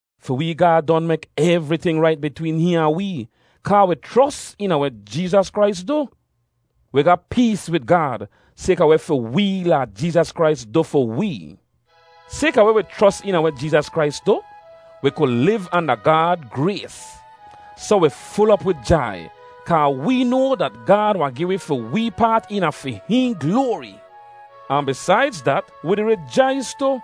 Fi wee Gaad don mek evriting rait bitween hihn ahn wee, kaa wi chros eena weh Jeezas Krais du. Wi ga pees wid Gaad sayka weh fi wee Laad Jeezas Krais du fi wee. Sayka weh wi chros eena weh Jeezas Krais du, wi ku liv anda Gaad grays. Soh wi ful op wid jai, kaa wee noa dat Gaad wahn gi wi fi wee paat eena fi hihn gloari. Ahn bisaidz dat, wi di rijais tu,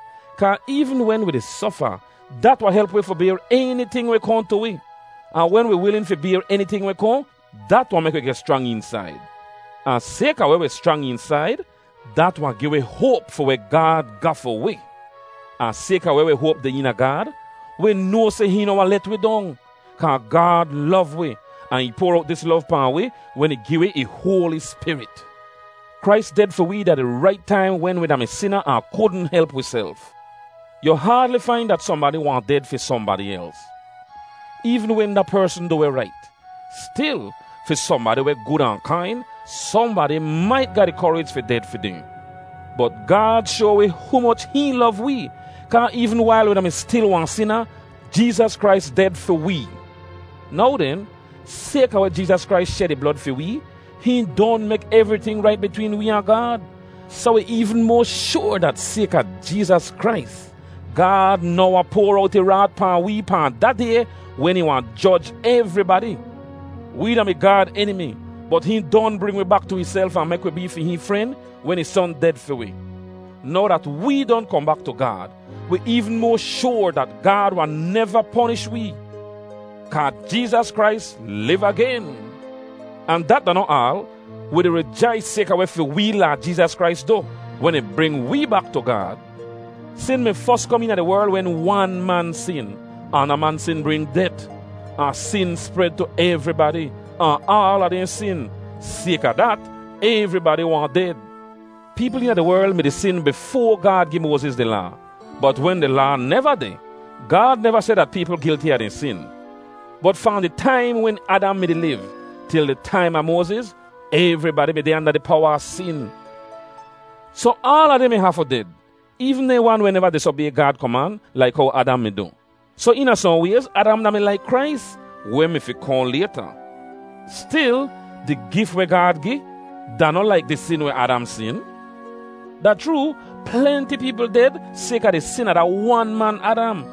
kaa eevn wen wi di sofa, dat wahn help wi fi bayr eniting weh kohn tu wi. Ahn wen wi wilin fi bayr eniting weh kohn, dat wahn mek wi geh schrang eensaid. Ahn sayka weh wi schrang eensaid, dat wahn gi wi hoap fi weh Gaad ga fi wi. Ahn sayka weh wi hoap deh eena Gaad, wi noa seh hihn noh wahn let wi dong, kaa Gaad lov wi, ahn ih poar owt dis lov pahn wi wen ih gi wi ih hoali Spirit. Krais ded fi wee da di rait taim wen wi da-mi sina ahn kudn help wiself. Yu haadli fain dat sohnbadi wahn ded fi sohnbadi els, eevn wen da persn du weh rait. Stil, fi sohnbadi weh gud ahn kain, sohnbadi mait ga di korij fi ded fi dehn. Bot Gaad shoa wi humoch hihn lov wee, kaa eevn wail wi da-mi stil wahn sina, Jeezas Krais ded fi wee. Now den, sayka weh Jeezas Krais shed ih blod fi wee, hihn don mek evriting rait bitween wee ahn Gaad. Soh wi eevn moa shoar dat sayka Jeezas Krais, Gaad noh wahn poar owt ih raat pahn wee pahn da Day wen ih wahn joj evribadi. Wee da-mi Gaad enimi, bot hihn don bring wi bak tu ihself ahn mek wi bee fi hihn fren wen ih Son ded fi wi. Now dat wee don kohn bak tu Gaad, wi eevn moa shoar dat Gaad wahn neva ponish wee, kaa Jeezas Krais liv agen. Ahn dat da noh aal. Wi di rijais sayka weh fi wee Laad Jeezas Krais du, wen ih bring wee bak tu Gaad. Sin mi fos kom eena di werl wen wan man sin, ahn da man sin bring det; ahn sin spred tu evribadi, ahn aala dehn sin. Sayka dat, evribadi wahn ded. Peepl eena di werl mi-di sin bifoa Gaad gi Moaziz di Laa, bot wen di Laa neva deh, Gaad neva seh dat peepl gilti a dehn sin. Bot fahn di taim wen Adam mi-di liv, til di taim a Moaziz, evribadi mi deh anda di powa a sin. Soh aala dehn mi hafu ded, eevn dehn wan weh neva disobay Gaad koman laik how Adam mi du. Soh eena sohn wayz Adam da-mi laik Krais, weh mi fi kohn layta. Stil, di gif weh Gaad gi, da noh laik di sin weh Adam sin. Da chroo, plenti peepl ded sayka di sin a da wan man Adam.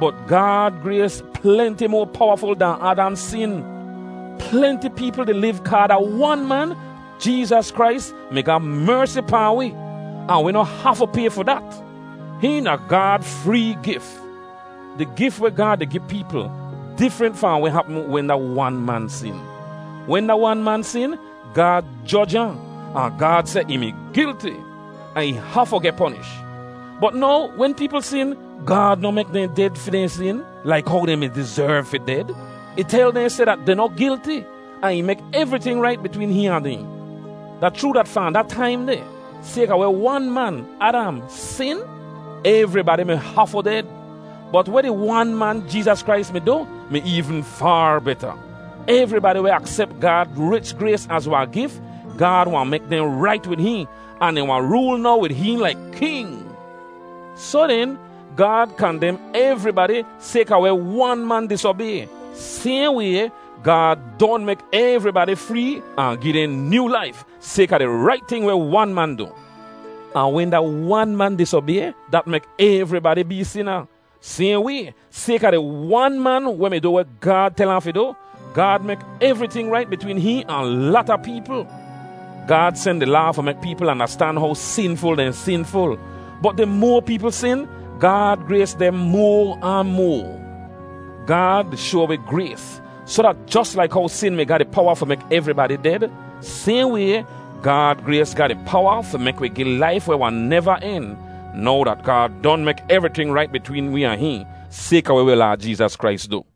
Bot Gaad grays plenti moa powaful dahn Adam sin. Plenti peepl di liv kaa da wan man, Jeezas Krais, mi ga mersi pahn wi, ahn wi noh hafu pay fi dat. Hihn da Gaad free gif. Di gif weh Gaad di gi peepl, difrent fahn weh hapm wen da wan man sin. Wen da wan man sin, Gaad joj ahn, ahn Gaad seh ih mi gilti, ahn ih hafu geh ponish. Bot now wen peepl sin, Gaad noh mek dehn ded fi dehn sin, laik how dehn mi dizerv fi ded. Ih tel dehn seh dat dehn noh gilti, ahn ih mek evriting rait bitween hihn ahn dehn. Da chroo dat fahn da taim deh, sayka weh wan man, Adam, sin, evribadi mi hafu ded. Bot weh di Wan man, Jeezas Krais mi du, mi eevn faar beta. Evribadi weh aksep Gaad rich grays az wahn gif, Gaad wahn mek dehn rait wid hihn, ahn dehn wahn rool now wid hihn laik king. Soh den, Gaad kandem evribadi sayka weh wan man disobay. Sayhn way, Gaad don mek evribadi free ahn gi dehn nyoo laif, sayka di rait ting weh wan man du. Ahn wen da wan man disobay, dat mek evribadi bee sina. Sayhn way, sayka di Wan man weh mi du weh Gaad tel ahn fi du, Gaad mek evriting rait bitween hihn ahn lata peepl. Gaad sen di Laa fi mek peepl andastan how sinful dehn sinful. Bot di moa peepl sin, Gaad grays deh moa ahn moa. Gaad di shoa wi grays, soh dat jos laik how sin mi ga di powa fi mek evribadi ded, sayhn way, Gaad grays ga di powa fi mek wi geh laif weh wahn neva en, now dat Gaad don mek evriting rait bitween wee ahn hihn, sayka weh wi Laad Jeezas Krais du.